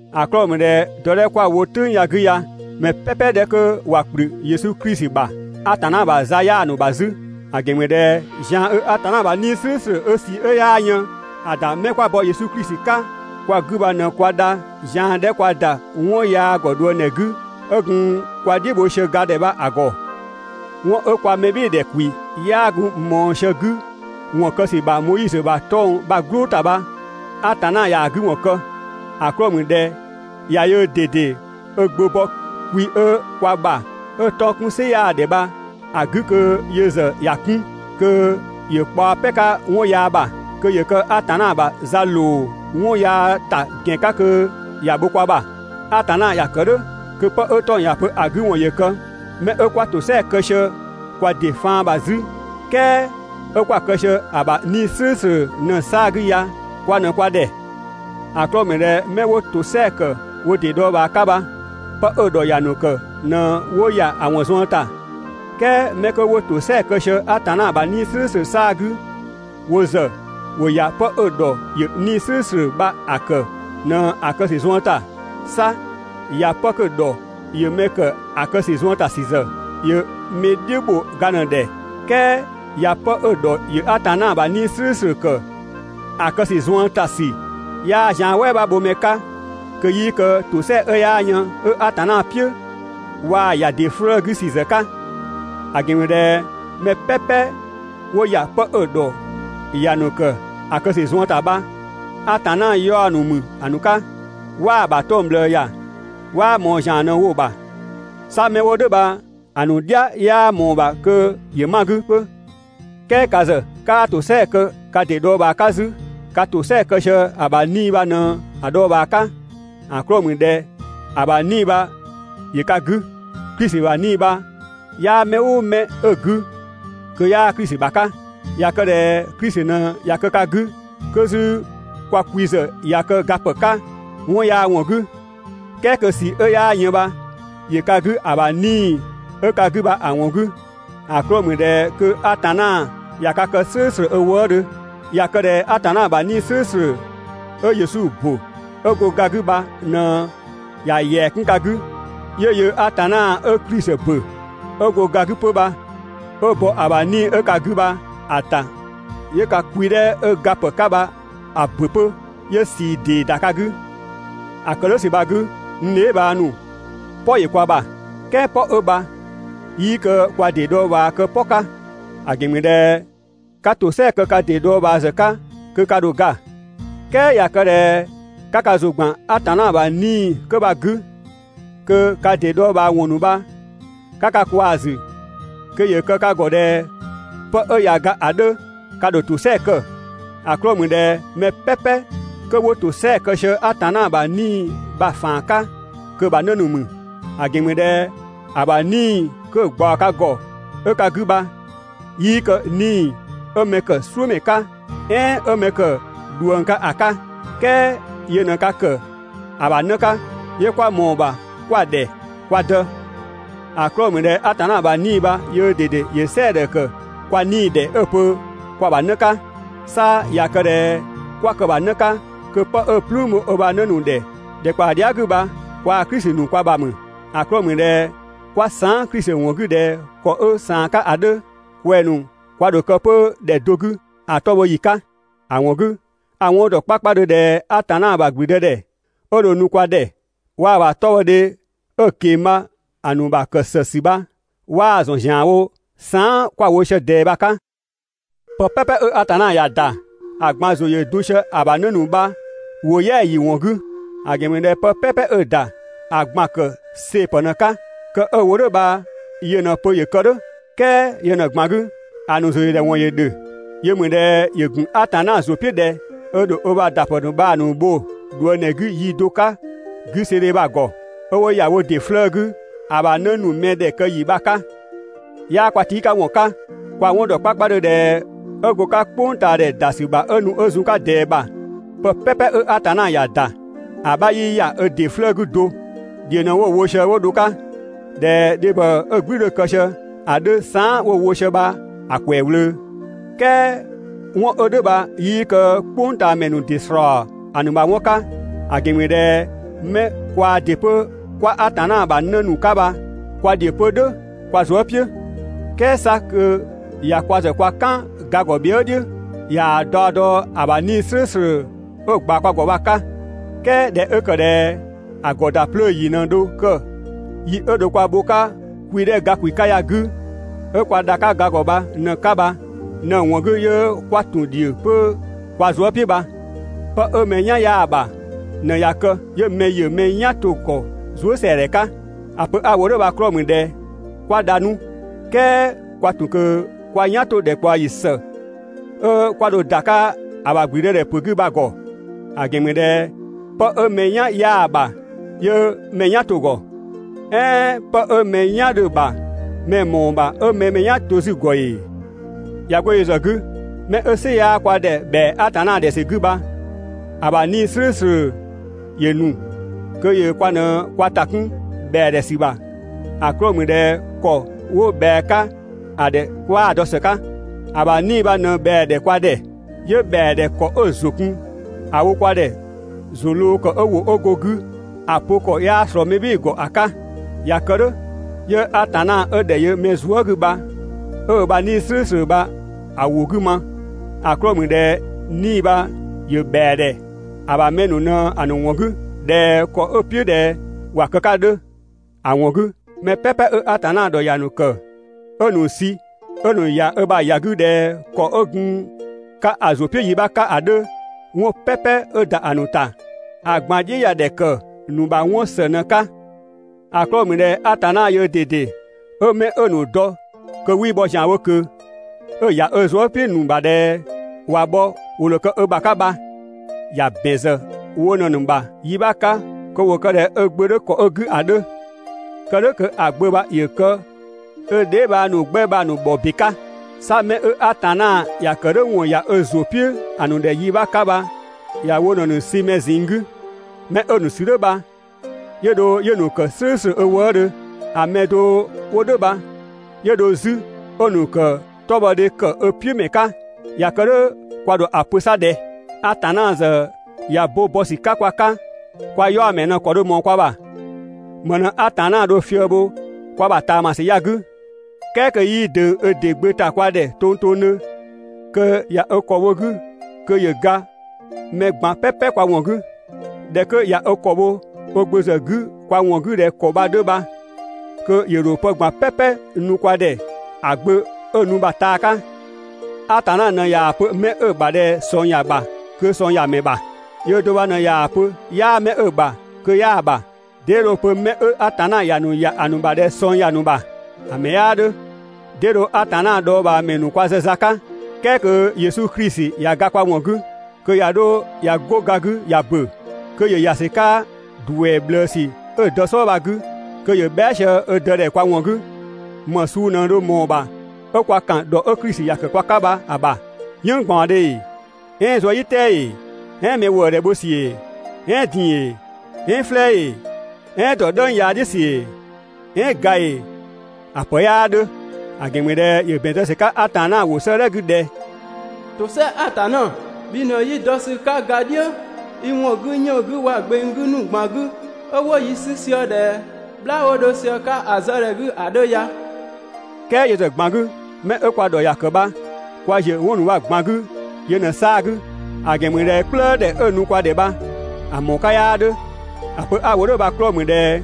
‑A 'klɔɔ‑ ‑mü ꞊dhɛ dɔ 'dhɛ 'kö 'kwa‑ wo "tʋ̈ng ya‑ 'gü ya, mɛ "pɛpɛ 'dhɛ 'kö ꞊wa ‑kplü Yesu Klisi ‑bha, Atanna ‑bha za 'yaa‑ ‑nu ‑bha 'zü. ‑A ‑gɛn ‑mü ꞊dhɛ zian 'ö Atanna ‑bha 'Nii‑ "slʋ̈ʋ̈slʋ̈ 'ö ꞊sii 'ö 'yaa yën‑ ‑da 'mɛ 'kwa bɔ Yesu Klisi 'ka kwa 'gü bha ꞊në kwa dha zian 'dhɛ kwa ‑da 'wɔn yaa ‑gɔ ꞊dhuëngdhɛ 'gü, 'ö gun kwa "dhiʋ̈ bho sië ga ‑dhɛ bha‑ ‑gɔ. 'Wɔn 'ö kwa mɛbhɩɩdhe ‑dhɛ ‑kwi 'yaa gun ꞊mɔɔ sië‑ 'gü ‑wɔn kë ‑sü ‑bha Moizö ‑bha 'tɔng‑ "gblʋʋ ‑ta bha, Atanna ꞊yaa‑ 'gü ‑wɔn kë. ‑A 'klɔɔ‑ ‑mü ꞊dhɛ ꞊ya yöö ꞊dede ö Gbö bɔ kwi 'ö kwa ‑bha 'ö 'tɔng‑ 'kun "sɩ 'yaa ‑dhɛ bha‑ 'gü kö yö ‑zë ‑ya 'kun, kö ‑yö kpaɔ "pɛ‑ 'ka 'wɔn yaa ‑bha, kö ‑yö kë Atanna ‑bha za ‑loo 'wɔn yaa ‑ta ‑gɛn 'ka kö ‑ya bho kwa ‑bha. Atanna ‑ya kë "dhʋ̈ kö 'pë 'ö 'tɔng‑ ‑ya pö‑ 'gü ‑wɔn ‑yö kë 'mɛ 'ö 'kwaa ‑tosɛa kë sië kwa ‑dɩ faan ‑bha 'zü, "kɛɛ 'ö 'kwa‑ kë sië‑ ‑bha 'Nii‑ "slʋ̈ʋ̈slʋ̈ ꞊në‑ 'saa‑ 'gü ya kwa ꞊në kwa ‑dhɛ. ‑A 'klɔɔ‑ ‑mü ꞊dhɛ mɛ 'wo ‑tosɛa ‑kë wo ‑dɩ dhɔɔbhaa 'ka bha, 'pë 'ö‑ ‑dhɔ ‑ya ‑nu ‑kë ꞊në 'wo ‑ya ‑a ‑wɔn zuën ‑ta, "kɛɛ 'mɛ 'kö 'wo ‑tosɛa kë sië Atanna ‑bha 'Nii‑ "slʋ̈ʋ̈slʋ̈ 'saa‑ 'gü, wo ‑zë ‑wo ‑ya 'pë 'ö‑ ‑dhɔ ‑yö 'Nii‑ "slʋ̈ʋ̈slʋ̈ bha‑ ‑kë ꞊në‑ kë ‑sü zuën ‑ta. 'Sa ‑ya 'pë 'kö‑ ‑dhɔ ‑yö mɛ ‑kë ‑a kë ‑sü zuën ‑ta ‑sü ‑zë, ‑yö mɛ "dhiʋ̈ ‑bho ga ꞊në‑ ‑dhɛ, "kɛɛ ‑ya 'pë 'ö‑ ‑dhɔ ‑yö Atanna ‑bha 'Nii‑ "slʋ̈ʋ̈slʋ̈ ‑kë ‑a kë ‑sü zuën ‑ta ‑sü 'yaa zian "wɛɛ 'bha bho mɛ 'ka kö 'yii kë ‑tosɛa 'ö 'yaa yën 'ö Atanna "piʋ̈, waa‑ ‑ya ‑dɩ 'flëë‑ 'gü ‑sü ‑zë 'ka. ‑A ‑gɛn ‑mü ꞊dhɛ mɛ "pɛpɛ 'wo ‑ya 'pë 'ö‑ ‑dhɔ ‑ya ‑nu ‑kë ‑a kë ‑sü zuën ‑ta bha, Atanna 'yaɔ‑ ‑mü ‑a ‑nu 'ka, 'waa‑ ‑bha 'tɔng‑ ꞊bhlëë ‑ya, 'waa ꞊mɔɔ ‑zian ꞊në‑ wo‑ ‑bha. 'Sa 'mɛ 'wo "dhʋ̈ bha‑ ‑nu "dhia 'yaa ꞊mɔɔ‑ ‑bha kö ‑yö 'ma‑ 'gü 'pö. "Kɛɛ ka ‑zë 'kaa ‑tosɛa kë ka ‑dɩ dhɔɔbhaa 'ka 'zü, ka ‑tosɛa kë sië ‑a ‑bha 'Nii‑ bha ꞊në‑ dhɔɔbhaa 'ka. ‑A 'klɔɔ‑ ‑mü ꞊dhɛ‑ ‑bha 'Nii‑ bha ‑yö ka 'gü. Klisi ‑bha 'Nii‑ bha 'yaa mɛ "ʋʋ mɛ 'ö‑ 'gü, kö 'yaa Klisi ‑bha 'ka. ꞊Ya kë ꞊dhɛ Klisi ꞊në ꞊ya kë ka 'gü, 'kö 'zü ka kwi ‑zë ꞊ya kë ga ‑pë 'ka 'wɔn yaa ‑wɔn 'gü, "kɛɛ kö ꞊sii 'ö 'yaa yën bha ‑yö ka 'gü ‑a ‑bha 'Nii‑ 'ö ka 'gü bha‑ ‑wɔn 'gü, ‑a 'klɔɔ‑ ‑mü ꞊dhɛ kö Atanna ꞊ya ka kë "slʋ̈ʋ̈slʋ̈ ö wëëdhö. ꞊Ya kë ꞊dhɛ Atanna ‑bha 'Nii‑ "slʋ̈ʋ̈slʋ̈ 'ö Yesu ‑bö 'ö go ga 'gü bha ꞊në ꞊ya ‑yɛa 'kun ka 'gü, 'yö yöö Atanna 'ö Klisi ‑bö 'ö go ga 'gü 'pö bha, 'ö bɔ‑ ‑bha 'Nii‑ 'ö ka 'gü bha‑ ‑ta 'yö ka kwi 'dhɛ 'ö gapë 'ka bha‑ ‑bö 'pö, 'yö ꞊sii ‑dee ‑da ka 'gü. ‑A ‑kë "dhʋ̈ ‑sü bha‑ 'gü, n dheebhang ‑nu, "pɔ ‑yö kwa ‑bha. "Kɛɛ "pɔ 'ö bha 'yii kë kwa ‑dɩ dhɔɔbhaa kë "pɔ 'ka. ‑A ‑gɛn ‑mü ꞊dhɛ 'ka ‑tosɛa kë ka ‑dɩ dhɔɔbhaa ‑zë 'ka kö ka ‑dho ga. "Kɛɛ ꞊ya kë ꞊dhɛ 'ka ka zü ‑gban Atanna ‑bha 'Nii‑ 'kö bha‑ 'gü, kö ka ‑dɩ dhɔɔbhaawɔn ‑nu bha 'ka ka kwaa‑ ‑zü, kö ‑yö kë ka ‑gɔ ꞊dhɛ 'pë ꞊ya ga ‑a 'dhö, ka ‑dho ‑tosɛa kë. ‑A 'klɔɔ‑ ‑mü ꞊dhɛ mɛ "pɛpɛ 'kö 'wo ‑tosɛa kë sië Atanna ‑bha 'Nii‑ bha‑ ‑faan 'ka, kö‑ ‑bha 'në ‑nu ‑mü. ‑A ‑gɛn ‑mü ꞊dhɛ ‑a ‑bha 'Nii‑ 'kö‑ ꞊gbaɔ ka ‑gɔ 'ö ka 'gü bha, 'yii kë 'Nii‑ 'ö mɛ ‑kë "suʋ̈ ‑mɛ 'ka, "ɛɛn 'ö mɛ ‑kë ꞊dhuëng 'ka ‑a 'ka. "Kɛɛ yö ꞊në ka ‑kë ‑a ‑bha 'në 'ka, 'yö 'kwa ꞊mɔɔ‑ ‑bha 'kwa‑ ‑dhɛ «Kwa Dë». ‑A 'klɔɔ‑ ‑mü ꞊dhɛ Atanna ‑bha 'Nii‑ bha yöö ꞊dede ‑ya "sɛɛdhɛ ‑kë kwa 'nii‑ ‑dhɛ 'ö‑ pö kwa‑ ‑bha 'në 'ka. 'Sa ꞊ya kë ꞊dhɛ 'kwa kë‑ ‑bha 'në 'ka, kö 'pë 'ö‑ "plüün bho ö ‑bha 'në ‑nu ‑dhɛ ‑dhɛkpaɔ dhia" 'gü bha kwaa‑ Klisi ‑nu kwa ‑bha ‑mü. ‑A 'klɔɔ‑ ‑mü ꞊dhɛ 'kwa saan" Klisi ‑wɔn 'gü ꞊dhɛ ‑kɔ 'ö ꞊saan‑ 'ka ‑a 'dhö, kwɛng‑ ‑nu kwa ‑dho kë 'pö ‑dhɛ do 'gü ‑a 'tɔ bhɔ ‑yi 'ka. ‑A ‑wɔn 'gü, a‑ 'wɔn ‑dɔ 'kpakpadhö ꞊dhɛ Atanna ‑bha ‑gblüdëdhɛ 'ö dho‑ nu kwa ‑dhɛ, waa‑ ‑bha 'tɔbhɔdhe 'ö‑ ꞊keng‑ bha‑ ‑nu ‑bha ‑kë ‑së ‑sü bha, 'waa‑ ‑zɔn ‑zianwo saan" 'kwa‑ wo sië ꞊dɛɛ bha‑ 'ka. Pë "pɛpɛ 'ö Atanna ‑ya ‑da, ‑a ꞊gban ‑zʋ ‑yö dun sië‑ ‑bha 'në ‑nu bha‑ ‑nu ‑wo "yɛa‑ ‑yi bha‑ ‑wɔn 'gü. ‑A ‑gɛn ‑mü ꞊dhɛ pë "pɛpɛ 'ö‑ ‑da ‑a ꞊gban‑ ‑kë see‑ ‑pë ꞊në‑ 'ka, kë 'ö‑ wo "dhʋ̈ bha yö ꞊në‑ pö ‑yö kë "dhʋ̈. "Kɛɛ yö ꞊në‑ ꞊gban 'gü, ‑a ‑nu ‑zʋyödhɛ ‑wɔn ‑yö ‑dhö. Yö ‑mü ꞊dhɛ ‑yö ‑gun Atanna ‑zʋ "piʋ̈ ꞊dhɛ ö ‑dho ö ‑bha ‑da ‑pë ‑nu bha‑ ‑nu ‑bho ꞊dhuëngdhɛ 'gü yi do 'ka 'güseedhe bha‑ ‑gɔ, 'ö 'wo ‑ya wo ‑dɩ 'flëë‑ 'gü ‑a ‑bha 'në ‑nu mɛdhɛ kë ‑yi bha‑ 'ka. 'Yaa kwa tii' 'ka ‑wɔn 'ka, kwa‑ 'wɔn ‑dɔ 'kpakpadhö ꞊dhɛ 'ö go‑ 'ka "kpʋngtaadhɛ ‑da ‑sü ‑bha 'ö nu 'ö zun‑ 'ka ꞊dɛɛ ‑bha, pë "pɛpɛ 'ö Atanna ‑ya ‑da, ‑a 'bha 'yii ‑ya ö ‑dɩ 'flëë‑ 'gü do, "dhiʋ̈ ꞊në 'wo‑ wo sië 'wo dho‑ 'ka, ꞊dhɛ dhebhɔ 'ö‑ "gblü 'dhö‑ kë sië ‑a 'dhö saan" 'wo‑ wo sië bha‑ ‑kwɛɛ ꞊wlöö. "Kɛɛ 'wɔn 'ö "dhʋ̈ bha 'yii kë "kpʋngtaamɛ ‑nu ‑dɩ ‑slɔɔ ‑a ‑nu ‑bha 'wɔn 'ka, ‑a ‑gɛn ‑mü ꞊dhɛ 'mɛ kwaa ‑dɩ 'pö 'kwa Atanna ‑bha 'në ‑nu 'ka bha kwa "dhiʋ̈ 'pö "dhʋ̈ kwa zuë" "piʋ̈. "Kɛɛ 'sa kö ꞊ya kwa ‑zë kwa "kan ‑ga ‑gɔ bhië" "dhiʋ̈ ꞊yaa‑ daɔ dɔ ‑a ‑bha 'Nii‑ "slʋ̈ʋ̈slʋ̈ 'ö‑ ꞊gbaɔ kwa ‑gɔ bha‑ 'ka. "Kɛɛ ꞊dhɛ 'ö ‑kë ꞊dhɛ ‑a ‑gɔ ‑da 'plöö ‑yi ꞊në dho kë yi 'ö dho kwa bho‑ 'ka kwi 'dhɛ ga ‑kwi 'ka ya‑ 'gü 'ö kwa dha‑ 'ka ga ‑gɔ bha ꞊në‑ 'ka bha ꞊në‑ ‑wɔn 'gü 'yö 'kwa ‑tun ‑dhiö 'pö kwa zuë" "piʋ̈ bha. Pë 'ö mɛ "yan 'yaa‑ ‑bha ꞊në ꞊ya kë 'yö mɛ ‑yö mɛ "yan to‑ ‑gɔ zuësɛadhɛ 'ka. ‑A pö 'a‑ wo "dhʋ̈ bha‑ 'klɔɔ‑ ‑mü ꞊dhɛ 'kwa dha 'nu, "kɛɛ kwa ‑tun ꞊kö kwa "yan 'to‑ ‑dhɛkpaɔyi ‑së 'ö 'kwa dho ‑da 'ka ‑a ‑bha ‑gblüdëdhɛpö 'gü bha‑ ‑gɔ. ‑A ‑gɛn ‑mü ꞊dhɛ pë 'ö mɛ "yan 'yaa‑ ‑bha 'yö mɛ‑ mɛ "yan to‑ ‑gɔ. "Ɛɛn 'pë 'ö mɛ "yan 'dhö‑ ‑bha mɛ‑ ‑mɔɔ ‑bha 'ö mɛ‑ mɛ "yan to 'zü‑ ‑gɔ ‑ee? ꞊Ya 'go yö ‑zë 'gü, 'mɛ 'ö "sɩ 'yaa kwa ‑dhɛ ‑bhɛa Atanna ‑dhɛ ‑sü 'gü bha, ‑a ‑bha 'Nii‑ "slʋ̈ʋ̈slʋ̈ ‑yö ‑nu kö ‑yö kwa ꞊në kwa ‑ta 'kun ‑bhɛa ‑dhɛ ‑sü ‑bha. ‑A 'klɔɔ‑ ‑mü ꞊dhɛ ‑kɔ 'wo ꞊bhɛa‑ 'ka ‑a ‑dhɛ 'kwaa‑ dɔ ‑së 'ka. ‑A ‑bha 'Nii‑ bha ꞊në ꞊bhɛa‑ ‑dhɛ kwa ‑dhɛ, 'yö ‑bhɛa ‑dhɛ ‑kɔ 'ö‑ ‑zʋ kun ‑a wo kwa ‑dhɛ ‑zʋ ꞊lɔɔ ‑kɔ 'ö ‑wʋ 'ö go‑ 'gü ‑a pö ‑kɔ 'yaa ꞊slɔɔ mɛ "bhɩɩ‑ ‑gɔ ‑a 'ka. ꞊Ya kë "dhʋ̈, 'yö Atanna 'ö ‑dhɛ yö mɛ zuë" 'gü bha 'ö ö ‑bha 'Nii‑ "slʋ̈ʋ̈slʋ̈ bha‑ ‑wʋ 'gü ma, ‑a 'klɔɔ‑ ‑mü ꞊dhɛ 'Nii‑ bha ‑yö ‑bhɛa ‑dhɛ ‑a ‑bha mɛ ‑nu ꞊në‑ ‑nu ‑wɔn 'gü ꞊dhɛ ‑kɔ 'ö‑ "piʋ̈ ꞊dhɛ ‑wa kë‑ 'ka ‑a 'dhö. ‑A ‑wɔn 'gü, mɛ "pɛpɛ 'ö Atanna ‑dhɔ ‑ya ‑nu ‑kë 'ö‑ ‑nu sü 'ö‑ ‑nu ‑ya ö ‑bha ‑ya 'gü ꞊dhɛ ‑kɔ 'ö gun‑ 'ka‑ ‑zʋ "piʋ̈ yi 'bha 'ka ‑a 'dhö, 'wɔn "pɛpɛ 'ö ‑da ‑a ‑nu ‑ta, ‑a ꞊gban "dhiʋ̈ ‑ya ‑dhɛ ‑kë ‑nu ‑bha 'wɔn ‑së ꞊në‑ 'ka. ‑A 'klɔɔ‑ ‑mü ꞊dhɛ Atanna yöö ꞊dede 'ö 'mɛ 'ö‑ ‑nu dɔ kö 'wii bhɔ ‑zianwo ꞊kö, 'ö‑ ‑ya ö zuë" "piʋ̈‑ ‑nu ‑bha ꞊dhɛ ꞊wa bhɔ ‑wo ‑dho kë ö ‑bha 'ka bha, ‑ya ‑bɛn ‑zë wo ꞊në‑ ‑nu ‑bha yi 'bha 'ka kö ‑wo kë ꞊dhɛ ö Gbö 'dhö ‑kɔ 'ö‑ 'gü ‑a 'dhö. Kë "dhʋ̈ kö ‑a Gbö bha ‑yö kë ö dheebhang ‑nu 'gbɛ bha‑ ‑nu ‑bhɔ ‑be 'ka. 'Sa 'mɛ 'ö Atanna ‑ya ‑kë "dhʋ̈ ‑wɔn ‑ya ö ‑zʋ "piʋ̈‑ ‑nu ‑dhɛ yi 'bha 'ka bha ‑ya wo ꞊në‑ ‑nu sü mɛ ꞊zinng 'gü. 'Mɛ 'ö‑ ‑nu sü "dhʋ̈ bha, 'yö dho 'yö‑ ‑nu ‑kë "slʋ̈ʋ̈slʋ̈ ö wëëdhö. ‑A mɛ do 'wo "dhʋ̈ bha, 'yö dho 'zü 'ö‑ ‑nu ‑kë 'tɔbhɔdhe ‑kë ö "piʋ̈ ‑mɛ 'ka. ꞊Ya kë "dhʋ̈ kwa ‑dho ‑a pö 'sa ꞊dhɛ? Atanna ‑zë ꞊ya bo bɔ ‑sü 'ka kwa 'ka, kwa 'yaɔ‑ ‑mɛɛ ꞊në ‑kɔ dho ꞊mɔɔ kwa ‑bha? ‑Më ꞊në Atanna dho‑ fië‑ bho kwa ‑bha ꞊taamasü ya‑ 'gü, "kɛɛ kö 'yii ꞊döng ö de Gbö ‑ta kwa ‑dhɛ tongtongdhö, kö ꞊ya ö ‑kɔ bho‑ 'gü kö ‑yö ga mɛ ꞊gban "pɛpɛ kwa ‑wɔn 'gü. ꞊Dhɛ 'kö ꞊ya ö ‑kɔ bho ö Gbö ‑zë 'gü kwa ‑wɔn 'gü ꞊dhɛ ‑kɔ bha‑ 'dhö bha, kö ‑yö ‑dho pë ꞊gban "pɛpɛ nu kwa ‑dhɛ ‑a Gbö 'ö‑ nu bha‑ taa 'ka. Atanna ꞊në ꞊yaa‑ pö 'mɛ 'ö‑ ‑bha ꞊dhɛ ꞊sɔng ‑ya ‑bha kö ꞊sɔng ‑ya ‑mɛ ‑bha. Yöö do bha ꞊në ꞊yaa‑ pö 'yaa 'mɛ 'ö‑ ‑bha kö 'yaa‑ ‑bha. 'Dee dho‑ pö 'mɛ 'ö Atanna ‑ya ‑nu ‑ya ‑a ‑nu ‑bha ꞊dhɛ ꞊sɔng ‑ya ‑nu ‑bha? ‑A ‑mɛ 'yaa 'dhö! 'Dee dho Atanna dhɔɔbhaamɛ ‑nu kwa zë za 'ka, "kɛɛ kö Yesu Klisi ꞊ya ga kwa ‑wɔn 'gü, kö ꞊ya 'dho ꞊ya 'go ga 'gü ꞊ya ‑bö, kö ‑yö ‑ya ‑sü 'ka ‑duɛ ꞊bhlëësü 'ö‑ Dë "sɔɔ bha‑ 'gü, kö ‑yö bhɛa" sië ö Dë ‑dhɛ kwa ‑wɔn 'gü. ‑Më suu ꞊në dho mɔɔ‑ ‑bha 'ö 'kwa ‑kan ‑dhɔ 'ö Klisi ‑ya ‑kë kwa 'ka bha‑ ‑bha. "Yënng ꞊gbaɔndhe ‑ee? "Ɛɛn zuëdhiʋ̈tɛɛ ‑ee? "Ɛɛn mɛ ‑wëëdhɛ bho ‑sü ‑ee? "Ɛɛn din‑ ‑ee? "Ɛɛn "flɛɛ ‑ee? "Ɛɛn ‑dɔ "dhëng yaa "dhiʋ̈ ‑sü ‑ee? "Ɛɛn ga ‑ee? ‑A ‑pë 'yaa 'dhö. ‑A ‑gɛn ‑mü ꞊dhɛ ‑yö ‑bɛn zë ‑sü 'ka Atanna ‑wʋ 'sëëdhɛ 'gü ꞊dhɛ: «(‑Tosɛa Atanna,) bhi ꞊në 'yi dɔ ‑sü 'ka ga "dhiʋ̈ i ‑wɔn 'gü 'yënng‑ 'gü waa‑ gbeng ‑nu ꞊gban 'gü, 'ö 'wo yi 'sü sië ꞊dhɛ "bhlaa 'wo 'dho sië‑ 'ka ‑a zë ‑dhɛ 'gü ‑a 'dhö ya.» "Kɛɛ yö ‑zë ꞊gban 'gü, 'mɛ 'ö kwa ‑dhɔ ‑ya ‑kë bha, kwa ‑ziö 'wɔn ‑nu bha‑ ꞊gban 'gü yö ꞊në‑ 'saa‑ 'gü, ‑a ‑gɛn ‑mü ꞊dhɛ "kplëë ‑dhɛ 'ö‑ nu kwa ‑dhɛ bha, ‑a ‑mɔɔ 'ka 'yaa 'dhö. ‑A pö 'a‑ wo "dhʋ̈ bha‑ 'klɔɔ‑ ‑mü ꞊dhɛ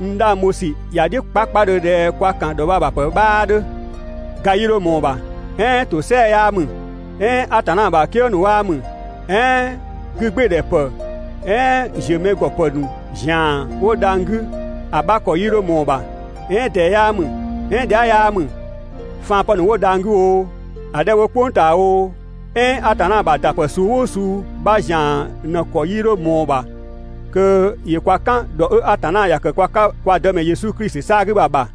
n 'dhang bho ‑sü ‑ya "dhiʋ̈ 'kpakpadhö ꞊dhɛ kwa ‑kan ‑dhɔ bha‑ ‑bha ‑pë 'bhaa 'dhö: Ga 'yii 'dho ꞊mɔɔ‑ ‑bha, "ɛɛn ‑tosɛa 'yaa ‑mü, "ɛɛn Atanna ‑bha "kië ‑nu 'waa ‑mü, "ɛɛn 'gügbɩɩdhɛpë "ɛɛn ‑ziö mɛ ‑gɔ ‑pë ‑nu zian 'wo dhang‑ 'gü ‑a 'bha ‑kɔ 'yii 'dho ꞊mɔɔ‑ ‑bha, "ɛɛn ꞊dɛɛ 'yaa ‑mü, "ɛɛn dhia" 'yaa ‑mü, faan ‑pë ‑nu 'wo dhang‑ 'gü oo, ‑a 'dhɛ 'wo "kpʋng ꞊taa oo, "ɛɛn Atanna ‑bha ‑dapë suu "ʋʋ suu 'bha ‑zian ꞊në‑ ‑kɔ 'yii 'dho ꞊mɔɔ‑ ‑bha kö ‑yö kwa "kan ‑dhɔ 'ö Atanna ‑ya ‑kë kwa 'ka kwa Dëmɛ Yesu Klisi 'saa‑ 'gü bha‑ ‑bha.